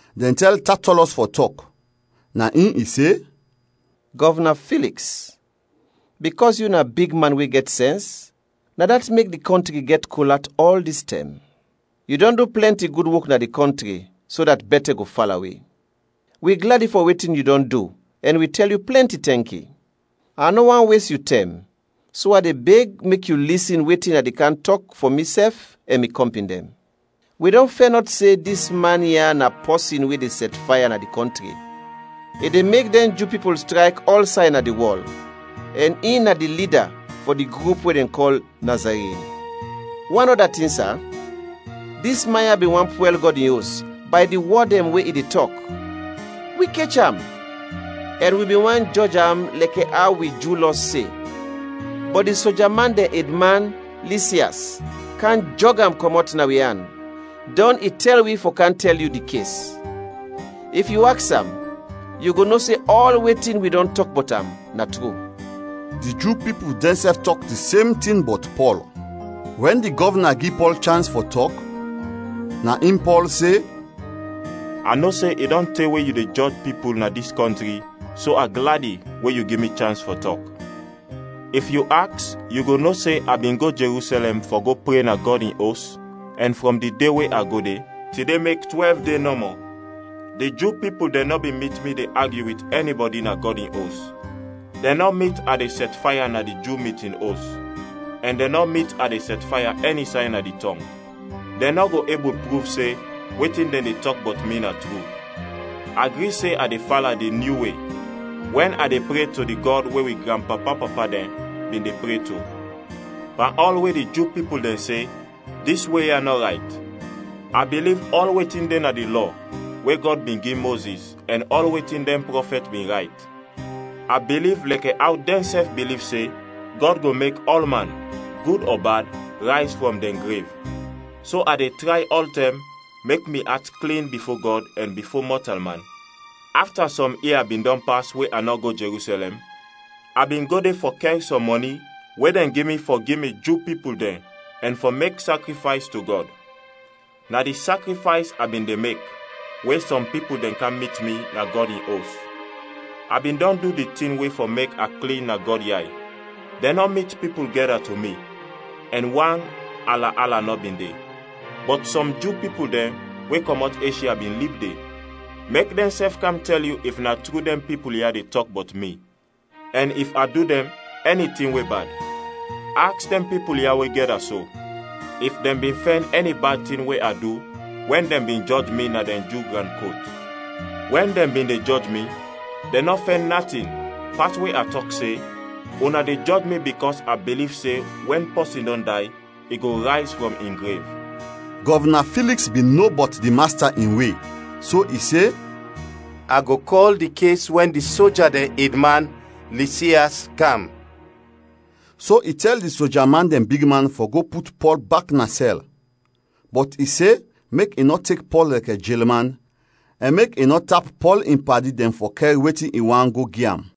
Dɛn tɛl Tatɔlɔs fɔ tɔk, na in i se, “Gɔvna Filiks, bikɔs yu na bigman we gɛt sɛns, na dat mek di kɔntri gɛt kol at ɔl dis tɛm. Yu dɔn du plɛnti gud wok na di kɔntri so dat bɛtɛ go fala wi. Wi gladi fɔ wetin yu dɔn du ɛn wi tɛl yu plɛnti tɛnki. A nɔ want wes yu tɛm so a de beg yu mek yu lisin wetin a de kam tɔk fɔ misɛf ɛn mi kɔmpin dɛn. Wi dɔn fɛnɔt se dis man ya na pɔsin we de sɛtfaya na di kɔntri, i de mek dɛn Ju pipul strayk ɔlsay na di wɔl ɛn in na di lida fɔ di grup we dɛn kɔl Nazarin. Wan ɔda tin, sa, dis man ya bin want pwɛl Gɔd in Os bay di wɔd dɛn we i de tɔk. Wi kech am, [ɛn wi bin want jɔj am lɛkɛ aw wi Ju Lɔ se, bɔt di soja man dɛn edman, Lisias kam jɔg am kɔmɔt na wi an. Dɔn i tɛl wi fɔ kam tɛl yu di kes.] If yu aks am, yu go no se ɔl wetin wi dɔn tɔk bɔt am na tru.” Di Ju pipul dɛnsɛf tɔk di sem tin bɔt Pɔl. Wɛn di gɔvna gi Pɔl chans fɔ tɔk, na in Pɔl se, “A no se i dɔn te we yu de jɔj pipul na dis kɔntri so a gladi we yu gi mi chans fɔ tɔk. If yu aks, yu go no se, a bin go Jerusɛlɛm fɔ go pre na Gɔd In Os ɛn frɔm di de we a go de, tide mek twɛlv de nɔmɔ. Di Ju pipul dɛn nɔ bin mit mi de agyu wit ɛnibɔdi na Gɔd in Os, dɛn nɔ mit a de sɛtfaya na di Ju mitin os, ɛn dɛn nɔ mit a de sɛtfaya ɛni say na di tɔng. Dɛn nɔ go ebul pruv se wetin dɛn de tɔk bɔt mi na tru. A gri se a de fala di nyu We wɛn a de pre to di Gɔd we wi granpapa-papa dɛn bin de pre to, pan ɔl we di Ju pipul dɛn se dis We ya nɔ rayt. A biliv ɔl wetin de na di Lɔ we Gɔd bin gi Mozis ɛn ɔl wetin dɛn prɔfɛt bin rayt. A biliv lɛkɛ aw dɛnsɛf biliv se Gɔd go mek ɔlman, gud ɔ bad, rayz frɔm dɛn grev. So a de tray ɔltɛm mek mi at klin bifo Gɔd ɛn bifo mɔtalman. “Afta sɔm ia bin dɔn pas we a nɔ go Jerusɛlɛm, a bin go de fɔ kɛr sɔm mɔni we dɛn gi mi fɔ gi mi Ju pipul dɛn ɛn fɔ mek sakrifays to Gɔd. Na di sakrifays a bin de mek we sɔm pipul dɛn kam mit mi na Gɔd in Os. A bin dɔn du di tin we fɔ mek a klin na Gɔd yay. Dɛn nɔ mit pipul gɛda to mi ɛn wan ala-ala nɔ bin de. Bɔt sɔm Ju pipul dɛn we kɔmɔt Eshya bin lib de; mek dɛnsɛf kam tɛl yu if na tru dɛn pipul ya de tɔk bɔt mi ɛn if a du dɛn ɛni tin we bad. Aks dɛn pipul ya we gɛda so if dɛn bin fɛn ɛni bad tin we a du wɛn dɛn bin jɔj mi na dɛn Ju gran kot. Wɛn dɛn bin de jɔj mi, dɛn nɔ fɛn natin pas we a tɔk se, ‘Una de jɔj mi bikɔs a biliv se wɛn pɔsin dɔn day, i go rayz frɔm in grev!’” Gɔvna Filiks bin no bɔt di Masta in We so i se, “A go kɔl di kes wɛn di soja dɛn edman, Lisias kam.” So i tɛl di soja dɛn bigman fɔ go put Pɔl bak na sɛl, bɔt i se mek i nɔ tek Pɔl lɛkɛ jelman ɛn mek i nɔ tap Pɔl in padi dɛn fɔ kɛr wetin i want go gi am.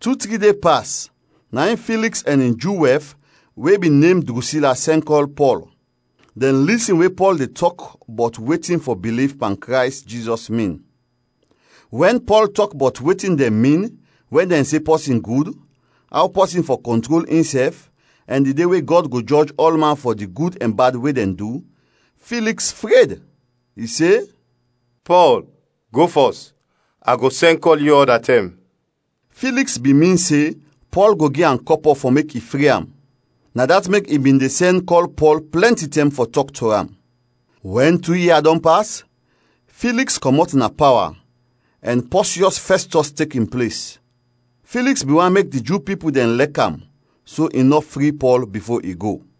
Tu-tri de pas, na in Filiks ɛn in Ju wɛf we bin nem Drusila sɛn kɔl Pɔl. Dɛn lisin we Pɔl de tɔk bɔt wetin fɔ biliv pan Krays Jizɔs min. Wɛn Pɔl tɔk bɔt wetin dɛn min wɛn dɛn se pɔsin gud, aw pɔsin fɔ kɔntrol insɛf, ɛn di de we Gɔd go jɔj ɔlman fɔ di gud ɛn bad we dɛn du, Filiks fred; i se, “Pɔl, go fɔs. A go sɛn kɔl yu ɔda tɛm.” Filiks bin min se Pɔl go gi am kɔpɔ fɔ mek i fri am. Na dat mek i bin de sɛn kɔl Pɔl plɛnti tɛm fɔ tɔk to am. Wɛn tu ia dɔn pas, Filiks kɔmɔt na pawa ɛn Pɔsiɔs Fɛstɔs tek in ples. Filiks bin want mek di Ju pipul dɛn lɛk am so i nɔ fri Pɔl bifo i go.